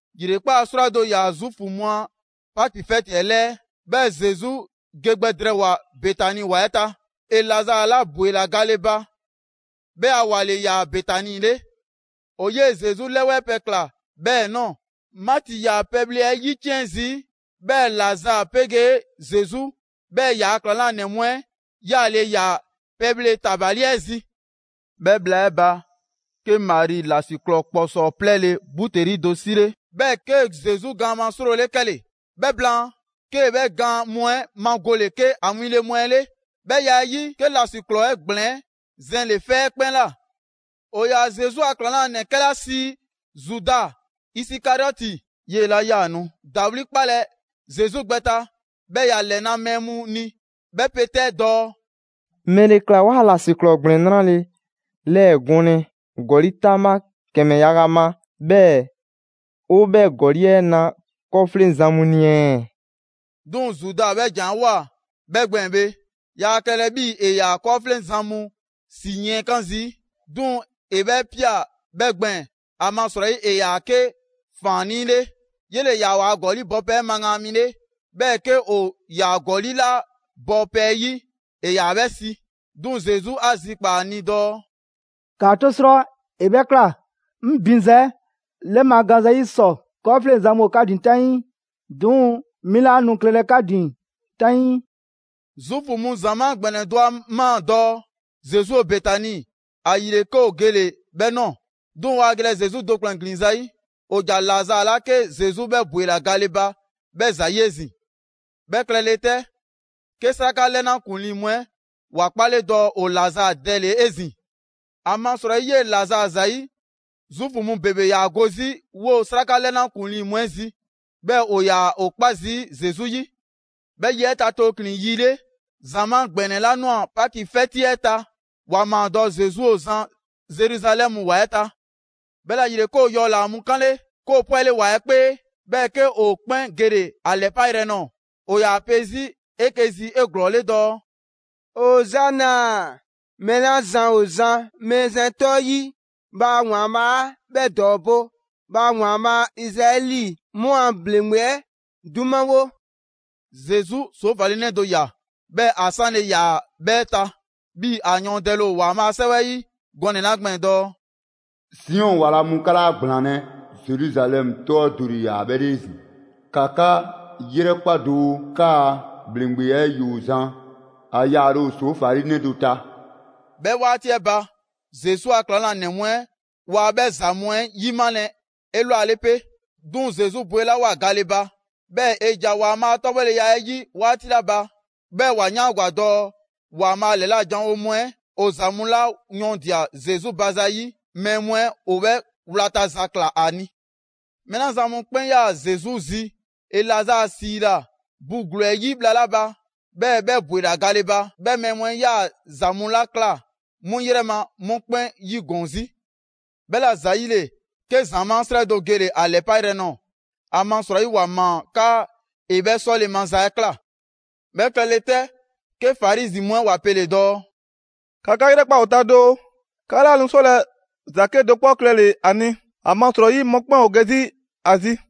‑Yrekpaa' 'srwado‑ ‑yaa Zuufu mu a Paki 'fɛti 'ɛ 'lɛɛ, 'bhɛɛ‑ Zesu ge gbɛ drɛɛwoa‑ Betani ‑wa 'ɛ ta. ‑E Lazaa 'la ‑bwela gale ba, 'bhɛ a ‑wa ‑le ‑yaa Betani 'le. ‑O 'yee Zesu 'lɛwɛɛ pɛ ꞊kla 'bhɛɛ‑ ꞊nɔɔ. Maati ‑yaa pɛbhle 'ɛ 'yiciɛn zii'. 'Bhɛɛ‑ Lazaa 'pegee Zesu 'bhɛɛ‑ ‑yaa' ‑klaŋlanɛ mu 'ɛ 'yaale‑ ‑yaa pɛbhle ‑tabali 'ɛ zi. 'Bhɛ bhla 'ɛ ba, 'ke Mari ‑lasiklɔɔ ‑kpɔsɔɔ 'plɛɛle‑ buteli do 'sile, 'bhɛɛ‑ 'kee‑ Zesu gaan ma 'srole 'kɛle‑. 'Bhɛ blaan, 'kee‑ 'bhɛ gaan mu 'ɛ magole 'ke ‑a winle mu 'ɛ 'le. 'Bhɛ ya 'ɛ 'yi, 'ke ‑lasiklɔɔ 'ɛ ‑gblɛn 'ɛ zɛnle‑ 'fɛ 'ɛ 'kpɛn ꞊la. ‑O ‑yaa Zesu a ‑klaŋlanɛ 'kɛla sii Zuda Isikariɔti, 'yee‑ 'la 'yaa‑ nu ‑dawli' 'kpalɛ‑ Zesu gbɛ ta, 'bhɛɛ‑ ‑ya ‑lɛna' mɛɛ mu ni, 'bhɛ pe 'tɛ dɔɔ: «‑Mɛle ‑kla waa ‑lasiklɔɔ ‑gblɛn 'nrale‑ 'lɛɛ‑ gɔnlɛ ‑gɔli' 'taŋbha ‑kɛmɛ yaga ma, 'bhɛɛ‑ ‑o 'bhɛ ‑gɔli' 'ɛ na 'kɔɔfleŋzan mu ni ɛɛ?» 'Duŋ‑ Zuda 'bhɛ ‑jan 'ɛ ꞊woa 'bhɛ gbɛɛn‑ bhe, yaa klɛlɛ 'bhii‑ ‑e ‑yaa 'kɔɔfleŋzan mu ‑si yiɛnkan' zii'. 'Duŋ‑ ‑e 'bhɛ 'pia‑ bhɛ gbɛɛn‑, ‑amasrɔyi ‑e ‑yaa 'ke ‑faannii' 'le: 'Yele‑ ‑yaa ‑waa' ‑gɔli' bɔpɛ 'ɛ magaan mi 'le, 'bhɛɛ‑ 'ke ‑o ‑yaa ‑gɔli' 'la bɔ 'bhɛ 'yi, ‑e ‑yaa 'bhɛ 'si. 'Duŋ‑ Zesu 'a zikpaa‑ ‑a ni dɔɔ: «‑Kaa 'to 'srɔ! ‑E 'bhɛ ꞊kla, 'ŋ binza 'ɛ 'lɛɛmagaanza 'yi ‑sɔ. 'Kɔɔfleŋzan mu ‑o 'ka ‑din 'taŋii, 'duŋ‑ 'mi 'laa nu klɛlɛ 'ka ‑din 'taŋii.» Zuufu mu ‑zamaa' ‑gbɛnɛ do 'a ꞊maa dɔɔ Zesu ‑o Betani. ‑Ayile 'ke ‑o gele‑ 'bhɛ ꞊nɔɔ. 'Duŋ‑ waa gelɛ Zesu do ‑kplɛn ‑glin zayi', ‑o ‑ja Lazaa 'la 'ke Zesu 'bhɛ ‑bwela gale ba 'bhɛɛ‑ ‑zayi' 'ezin‑. 'Bhɛ klɛle 'tɛ, 'ke 'sraka 'lɛna ‑kuŋlii mu 'ɛ ‑wa 'kpale dɔɔ ‑o Lazaa dɛle‑ 'ezin‑. ‑Amasrɔyi 'yee‑ Lazaa ‑zayi', Zuufu mu ‑bebe ‑yaa go 'zi 'woo‑ 'sraka 'lɛna ‑kuŋlii mu 'ɛ 'zi, 'bhɛɛ‑ ‑o ‑yaa ‑o 'kpa zii' Zesu 'yi. 'Bhɛ yi 'ɛ ta tooklin‑ yi 'le, ‑zamaa' ‑gbɛnɛ 'la 'nwa‑ Paki 'fɛti 'ɛ ta, ‑wa ꞊maa dɔɔ Zesu ‑o zan Zeruzalɛmu ‑wa 'ɛ ta. 'Bhɛla‑ ‑yile, 'ke ‑o yɔ ‑laa mu 'kanle, 'ke ‑o 'pwɛle‑ ‑wa 'ɛ 'kpee, 'bhɛɛ‑ 'ke ‑o 'kpɛn gele‑ ‑a ‑lɛpa' yrɛ nɔɔ‑. ‑O ‑yaa 'pe 'zi 'eke‑ 'zi 'eglɔɔle dɔɔ: «Ozana! Mɛɛ 'la zan ‑o zan Mɛɛzan 'ɛ 'tɔ 'yi, bhaa ‑Waanbhaa' 'bhɛ ‑dɔɔbo'! Bhaa ‑Waanbhaa' Izraɛli mu a ‑bhleŋgbe 'ɛ 'dumawo!» Zesu ‑soofali 'nɛ do ꞊ya, 'bhɛɛ‑ ‑a 'sanle‑ ‑yaa 'bhɛɛ‑ ta, 'bhii‑ ‑a yɔɔndɛle ‑o ‑Waanbhaa' a 'Sɛwɛ 'yi gɔnɛ‑ 'la gbɛɛn‑ dɔɔ: «Siɔn ‑wa ‑la mu, 'ka 'laa ‑gblaanlɛ' (Zeruzalɛmu 'tɔ 'ɛ do ‑le ‑yaa 'bhɛ 'le 'ezin‑). ‑Ka 'ka 'yrɛkpa doo, 'kaa‑ ‑bhleŋgbe 'ɛ ‑yoo zan, ‑a yaale ‑o ‑soofali 'nɛ do ta.» 'Bhɛ 'waati 'ɛ ba, Zesu a ‑klaŋlanɛ mu 'ɛ waa 'bhɛ ‑za mu 'ɛ 'yimalɛ 'elwale 'pe. 'Duŋ‑ Zesu bwelawoa gale ba, 'bhɛɛ‑ ‑e ‑ja ‑Waanbhaa' a 'tɔbhɔleya 'ɛ 'yi 'waati 'la ba, 'bhɛɛ‑ ‑wa 'yaangwa‑ dɔɔ ‑Waanbhaa' ‑lɛla' janwo mu 'ɛ ‑o ‑za mu 'la yɔɔndia‑ Zesu ba zayi' mɛɛ mu 'ɛ ‑o 'bhɛɛ‑ wlata za ꞊kla ‑a ni. Mɛɛ 'la zan mu 'kpɛn 'yaa‑ Zesu zi ‑e Lazaa 'siila‑ bu ‑gluu 'ɛ 'yi bhla 'la ba, 'bhɛɛ‑ 'bhɛ ‑bwela gale ba; 'bhɛ mɛɛ mu 'ɛ 'yaa‑ ‑za mu 'la ꞊kla 'mu ‑yrɛ ma, 'mu 'kpɛn 'yigɔɔn‑ 'zi. 'Bhɛla‑ ‑zayile, 'ke ‑zamaa' 'srɛ do gele‑ ‑a ‑lɛpayrɛ nɔɔ‑. ‑Amasrɔyi ‑wa ‑maa 'kaa ‑e 'bhɛ 'sɔle‑ maza 'ɛ ꞊kla. 'Bhɛ klɛle 'tɛ, 'ke Farizi mu 'ɛ ‑wa pele‑ dɔɔ: «‑Ka 'ka 'yrɛkpa ‑o ta doo, 'ka 'laa nu 'sɔlɛ‑ ‑za 'kedo‑ 'kpɔ klɛle‑ ‑a ni, ‑amasrɔyi mɔkpɛn' ‑o ge 'zi ‑a zi.»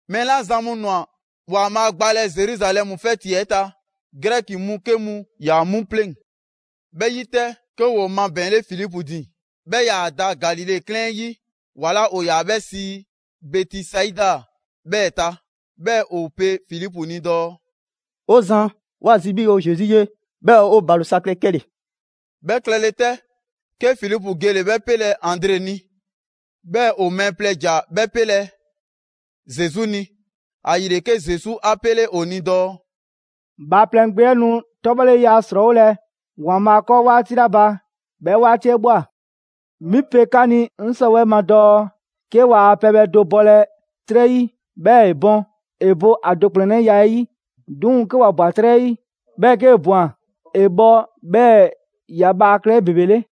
Mɛɛ 'la zan mu ‑nwa ‑Waanbhaa' gbalɛ Zeruzalɛmu 'fɛti 'ɛ ta, Grɛki mu 'ke mu ‑yaa 'mu pleŋ‑. 'Bhɛ 'yi 'tɛ, 'ke ‑woo mabɛɛnle Filipu ‑din, 'bhɛ 'yaa‑ da Galile 'klɛɛn 'yi ‑wa 'la ‑o ‑yaa 'bhɛ sii Bɛtisaida 'bhɛɛ‑ ta. 'Bhɛɛ‑ ‑o pe Filipu ni dɔɔ: «'O Zan, ꞊wa zi 'bhii‑ 'o Zesu 'ye, 'bhɛɛ‑ 'o ‑balo sa klɛ 'kɛle‑.» 'Bhɛ klɛle 'tɛ, 'ke Filipu gele‑ 'bhɛ 'pelɛ‑ Andre ni, 'bhɛɛ‑ ‑o mɛɛ plɛ ‑ja 'bhɛ 'pelɛ‑ Zesu ni. ‑Ayile, 'ke Zesu 'a pele ‑o ni dɔɔ: «Bhaaplɛŋ Gbe 'ɛ nu 'tɔbhɔleya 'srɔɔwolɛ ‑Waanbhaa' 'kɔɔ 'waati 'la ba, 'bhɛ 'waati 'ɛ ꞊bhwa. 'Mi pe 'ka 'ni 'ŋ 'sɔwɛɛ‑ ma dɔɔ: 'Ke waa pɛbhɛ do bɔlɛ 'trɛ 'yi, 'bhɛɛ‑ ‑e bɔn, ‑e bo ‑a do ‑kplɛnnɛya 'ɛ 'yi. 'Duŋ‑ 'ke ‑wa ꞊bwa 'trɛ 'yi, 'bhɛɛ‑ 'kee‑ ꞊bwan, ‑e bhɔ 'bhɛɛ‑ ‑ya bhaa klɛ 'ebebele.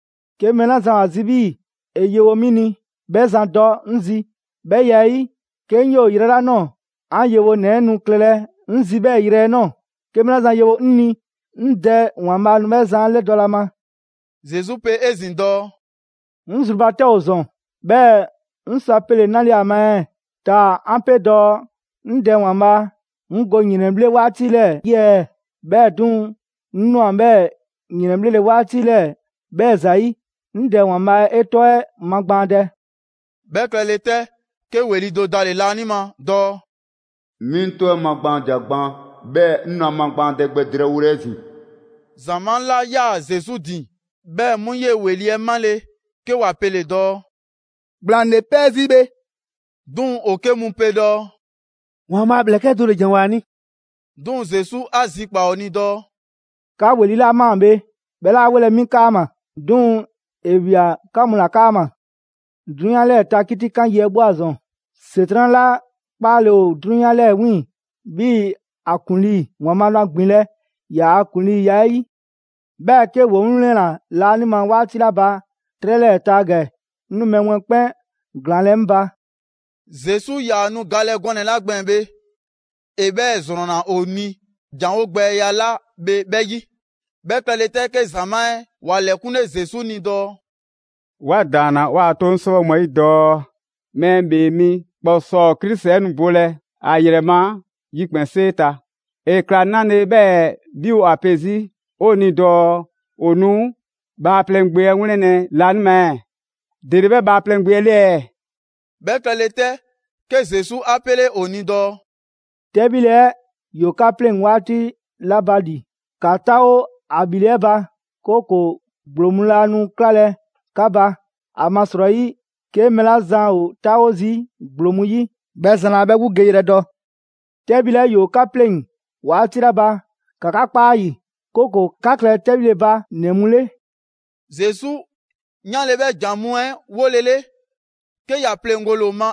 'Ke mɛɛ 'la zan ‑o ‑a zi 'bhii‑ ‑e yewo 'mi ni, 'bhɛ zan dɔ 'ŋ zi. 'Bhɛ ya 'ɛ 'yi, 'ke 'ŋ 'yoo‑ yrɛ 'la ꞊nɔɔ, 'an yewonɛ 'ɛ nu klɛlɛ 'ŋ zi 'bhɛɛ‑ yrɛ 'ɛ ꞊nɔɔ. 'Ke mɛɛ 'la zan yewo 'ŋ ni 'ŋ Dɛ ‑Waanbhaa' nu 'bhɛ zan 'ɛ ‑lɛdɔlɛ ‑a ma.» Zesu pe 'ezin‑ dɔɔ: «'Ŋ zru ba 'tɛ ‑o ‑zɔn. 'Bhɛɛ‑ 'ŋ sɔ a pele‑ 'nale‑ ‑a ma ɛɛ? Taa‑ 'an 'pe dɔɔ: 'Ŋ Dɛ ‑Waanbhaa, 'ŋ go ‑yrɛnbhle' 'waati 'lɛɛ‑ 'yi ɛɛ? 'Bhɛɛ‑ 'duŋ‑, 'ŋ 'nwa‑ 'bhɛɛ‑ ‑yrɛnbhle' 'waati 'lɛɛ‑ 'bhɛɛ‑ ‑zayi'. 'Ŋ Dɛ ‑Waanbhaa', 'e 'tɔ 'ɛ magbaandɛ!» 'Bhɛ klɛle 'tɛ, 'ke ‑weli' do dale‑ laanima dɔɔ: «'Mi 'ŋ 'tɔ 'ɛ magbaandia gban, 'bhɛɛ‑ 'ŋ nu ‑a magbaandɛ gbɛ drɛɛwolɛ 'ezin‑.» ‑Zamaa' 'la 'yaa‑ Zesu ‑din, 'bhɛ mu 'yee ‑weli' 'ɛ 'male‑, 'ke ‑wa pele‑ dɔɔ: «‑Gblaŋ ‑le 'pɛɛ zii' bhe». 'Duŋ‑ ‑o 'ke mu pe dɔɔ: «‑Waanbhaa' a ‑mlɛkɛ' do ‑le ‑janwoa ‑a ni!» 'Duŋ‑ Zesu 'a zikpaa‑ ‑o ni dɔɔ: «'Ka ‑weli' 'la ꞊maa bhe, 'bhɛ 'laa ‑welɛ' 'mi 'kaama‑, 'duŋ‑ ‑e ꞊wia 'ka mu ‑la 'kaama‑. 'Drunyan 'lɛɛ‑ ta 'kitikan yi 'ɛ ꞊bhwa ‑zɔn. ‑Setran' 'la 'kpaale‑ ‑o 'drunyan 'lɛɛ‑ 'wiiŋ‑ 'bhii‑ ‑a ‑kuŋlii, ‑Waanbhaa' nu ‑a ‑gbinlɛ' ‑yaa' ‑kuŋliiya 'ɛ 'yi. 'Bhɛɛ‑ 'ke ‑woo 'ŋ 'wlɛnna‑ laanima 'waati 'la ba 'trɛ 'lɛɛ‑ ta ‑gɛ, 'ŋ nu mɛɛ mu 'ɛ 'kpɛn ‑glaanlɛ' 'ŋ ba.» Zesu 'yaa‑ nu galɛ gɔnɛ‑ 'la gbɛɛn‑ bhe, ‑e 'bhɛɛ‑ ‑zrɔnna ‑o ni ‑janwo' gbɛya 'la bhe 'bhɛ 'yi. 'Bhɛ klɛle 'tɛ, 'ke ‑zamaa' 'ɛ ‑wa ‑lɛkunle Zesu ni dɔɔ: «'Wa ‑daanna 'waa‑ 'toŋ 'sɛwɛ mu 'ɛ 'yi dɔɔ Mɛɛ ‑Bhee Mi ‑Kpɔsɔɔ Krisi 'ɛ nu bolɛ ‑a ‑yrɛ ma ‑yikpɛnsee ta. ‑E ‑kla 'nale‑ 'bhɛɛ‑ 'bhi ‑o ‑a pe 'zi 'o ni dɔɔ: ‹‑O nu Bhaaplɛŋ Gbe 'ɛ 'wlɛnlɛ‑ laanima ɛɛ?› ‑Dele 'bhɛ Bhaaplɛŋ Gbe 'ɛ 'le ɛɛ?» 'Bhɛ klɛle 'tɛ, 'ke Zesu 'a 'pele ‑o ni dɔɔ: «'Tɛbhile 'ɛ nu ‑bhilɛ' 'ka 'pleŋ‑ 'waati sa. 'Tɛbhile 'ɛ ‑yoo 'ka 'pleŋ‑ 'waati 'la ba ‑li, ‑ka 'taawo ‑a ‑bhile' 'ɛ ba, 'kooko‑ ‑gblo mu laa nu 'klalɛ‑ 'ka ba. ‑Amasrɔyi 'ke mɛɛ 'la zan ‑o 'taawo zii' ‑gblo mu 'yi, 'bhɛ zan 'laa 'bhɛ 'gbu geyrɛ dɔ. 'Tɛbhile 'ɛ ‑yoo 'ka 'pleŋ‑ 'waati 'la ba, ‑ka 'ka 'kpa ‑a ‑yi, 'kooko‑ 'ka klɛ 'tɛbhile ba ‑nɛ mu 'le.» Zesu 'yanle‑ 'bhɛ ‑jan mu 'ɛ 'wolele, 'ke ‑ya pleŋgole ‑o ma,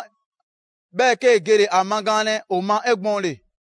'bhɛɛ‑ 'kee gele‑ ‑a magaanlɛ ‑o ma 'egbɔɔnle.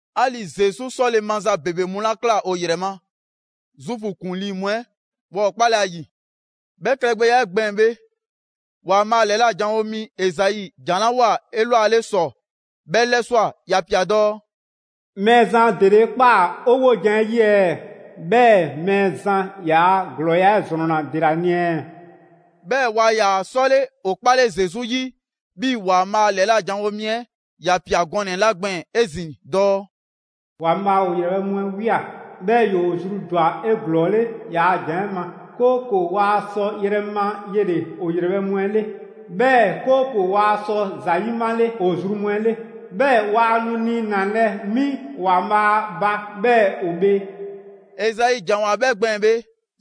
'Ali‑ Zesu 'sɔle‑ maza ‑bebe mu 'la ꞊kla ‑o ‑yrɛ ma, Zuufu ‑kuŋlii mu 'ɛ waa ‑o 'kpalɛ‑ ‑a ‑yi. 'Bhɛ klɛgbɛya 'ɛ gbɛɛn‑ bhe, ‑Waanbhaa' ‑lɛla' janwo mi Ezai ‑jan 'la ꞊woa 'elwale ‑sɔ, 'bhɛ 'lɛswa꞊; ‑ya ‑pia dɔɔ: «Mɛɛzan, ‑dele 'e ꞊kpaa 'o 'wojan‑ 'ɛ 'yi ɛɛ? 'Bhɛɛ‑ Mɛɛzan ‑yaa' ‑glɔɔya' 'ɛ ‑zrɔnna ‑de ‑la ni ɛɛ?» 'Bhɛɛ‑ waa ‑yaa 'sɔle ‑o 'kpale Zesu 'yi 'bhii‑ ‑Waanbhaa' ‑lɛla' janwo mi 'ɛ ‑ya ꞊pia gɔnɛ‑ 'la gbɛɛn‑ 'ezin‑ dɔɔ: «‑Waanbhaa' ‑o ‑yrɛbhɛ' mu 'ɛ ꞊wia, 'bhɛɛ‑ ‑yoo zru ‑dwa 'eglɔɔle ‑yaa' ‑jan 'ɛ ma, 'kooko‑ waa sɔ yrɛ ma yele‑ ‑o ‑yrɛbhɛ' mu 'ɛ 'le, 'bhɛɛ‑ 'kooko‑ waa sɔ ‑za 'yimale ‑o zru mu 'ɛ 'le, 'bhɛɛ‑ waa nu niinalɛ 'mi ‑Waanbhaa' ba, 'bhɛɛ‑ ‑o bhee.» Ezai ‑janwoa 'bhɛ gbɛɛn‑ bhe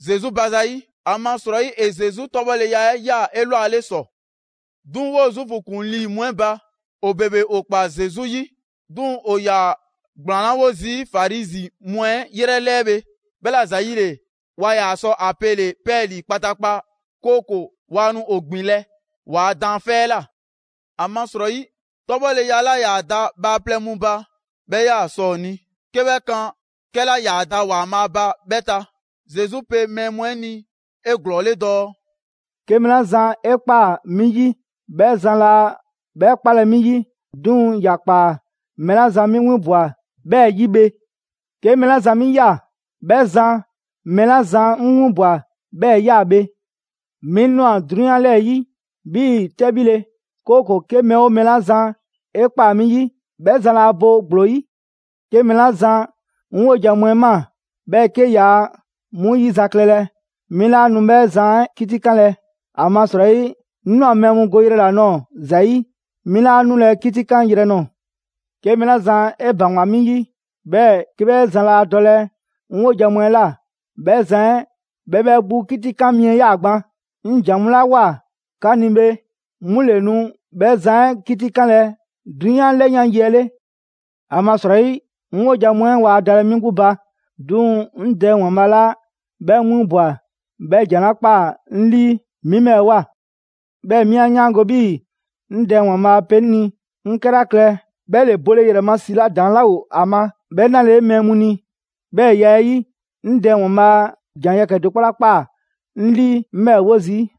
Zesu ba zayi', ‑amasrɔyi ‑e Zesu 'tɔbhɔleya 'ɛ ꞊ya 'elwale ‑sɔ. 'Duŋ‑, 'woo‑ Zuufu ‑kuŋlii mu 'ɛ ba, ‑o ‑bebe ‑o ‑kpaa Zesu 'yi. 'Duŋ‑ ‑o ‑yaa ‑gblaanlawo zii' Farizi mu 'ɛ 'yrɛ 'lɛɛ bhe, 'bhɛla‑ ‑zayile, waa ‑yaa sɔ ‑a pele‑ 'pɛɛlii‑ kpataakpa, 'kooko‑ waa nu ‑o ‑gbinlɛ' ‑waa' daanfɛ' 'ɛ ꞊la. ‑Amasrɔyi, 'tɔbhɔleya 'la 'yaa‑ da bhaaplɛŋ mu ba, 'bhɛ 'yaa‑ sɔ ‑o ni 'ke 'bhɛ kan 'kɛla 'yaa‑ da ‑Waanbhaa' ba 'bhɛ ta. Zesu pe mɛɛ mu 'ɛ ni 'eglɔɔle dɔɔ: «'Ke mɛɛ 'la zan 'e ꞊kpaa 'mi 'yi, 'bhɛ zan laa 'bhɛ 'kpalɛ‑ 'mi 'yi, 'duŋ‑ ‑ya ꞊kpaa mɛɛ 'la zan 'mi 'winbwa‑ 'bhɛɛ‑ 'yi bhe. 'Ke mɛɛ 'la zan 'mi ꞊ya, 'bhɛ zan mɛɛ 'la zan 'ŋ 'winbwa‑ 'bhɛɛ‑ ꞊ya bhe. 'Mi ꞊nwa 'drunyan 'lɛɛ‑ 'yi 'bhii‑ 'tɛbhile, 'kooko‑ 'ke mɛɛ 'oo mɛɛ 'la zan 'e ꞊kpaa 'mi 'yi, 'bhɛ zan laa bo ‑gblo 'yi. 'Ke mɛɛ 'la zan 'ŋ 'wojan‑ mu 'ɛ ꞊maa, 'bhɛɛ‑ 'ke yaa 'mu 'yizaklɛlɛ, 'mi 'laa nu 'bhɛ zan 'ɛ 'kitikanlɛ. ‑Amasrɔyi 'ŋ ꞊nwa mɛɛ mu go yrɛ ‑la nɔɔ‑ ‑za 'yi, 'mi 'laa 'nulɛ‑ 'kitikan yrɛ nɔɔ‑. 'Ke mɛɛ 'la zan 'e ‑baŋgwa 'mi 'yi, 'bhɛɛ‑ 'ke 'bhɛ zan laa dɔlɛ 'ŋ 'wojan‑ mu 'ɛ ꞊la, 'bhɛ zan 'ɛ 'bhɛ 'bhɛ 'gbu 'kitikan mi ꞊ya gban. 'Ŋ ‑jan mu 'la ꞊woa 'ka ni bhe, 'mu ‑le nu 'bhɛ zan 'ɛ 'kitikanlɛ 'drunyan 'lɛyan yi 'ɛ 'le. ‑Amasrɔyi 'ŋ 'wojan‑ mu 'ɛ waa dalɛ 'mi 'gbu ba. 'Duŋ‑ 'ŋ Dɛ ‑Waanbhaa' 'la 'bhɛ 'ŋ 'winbwa‑ 'bhɛ ‑jan 'la ꞊kpaa 'ŋ 'lii 'mi 'bhɛɛ‑ ꞊woa. 'Bhɛɛ‑ 'mi 'a 'yaango‑ 'bhii‑ 'ŋ Dɛ ‑Waanbhaa' pe 'ŋ ni 'ŋ 'kɛla klɛ, 'bhɛ ‑le bole ‑yrɛ ma ‑si 'la ‑daŋ' 'laa ‑o ‑a ma 'bhɛ nalele mɛɛ mu ni. 'Bhɛɛ‑ ya 'ɛ 'yi, 'ŋ Dɛ ‑Waanbhaa' ‑jan yɛkɛ‑ do 'kpɔ 'la ꞊kpaa 'ŋ 'lii 'ŋ 'bhɛɛ‑ 'wo zii'.»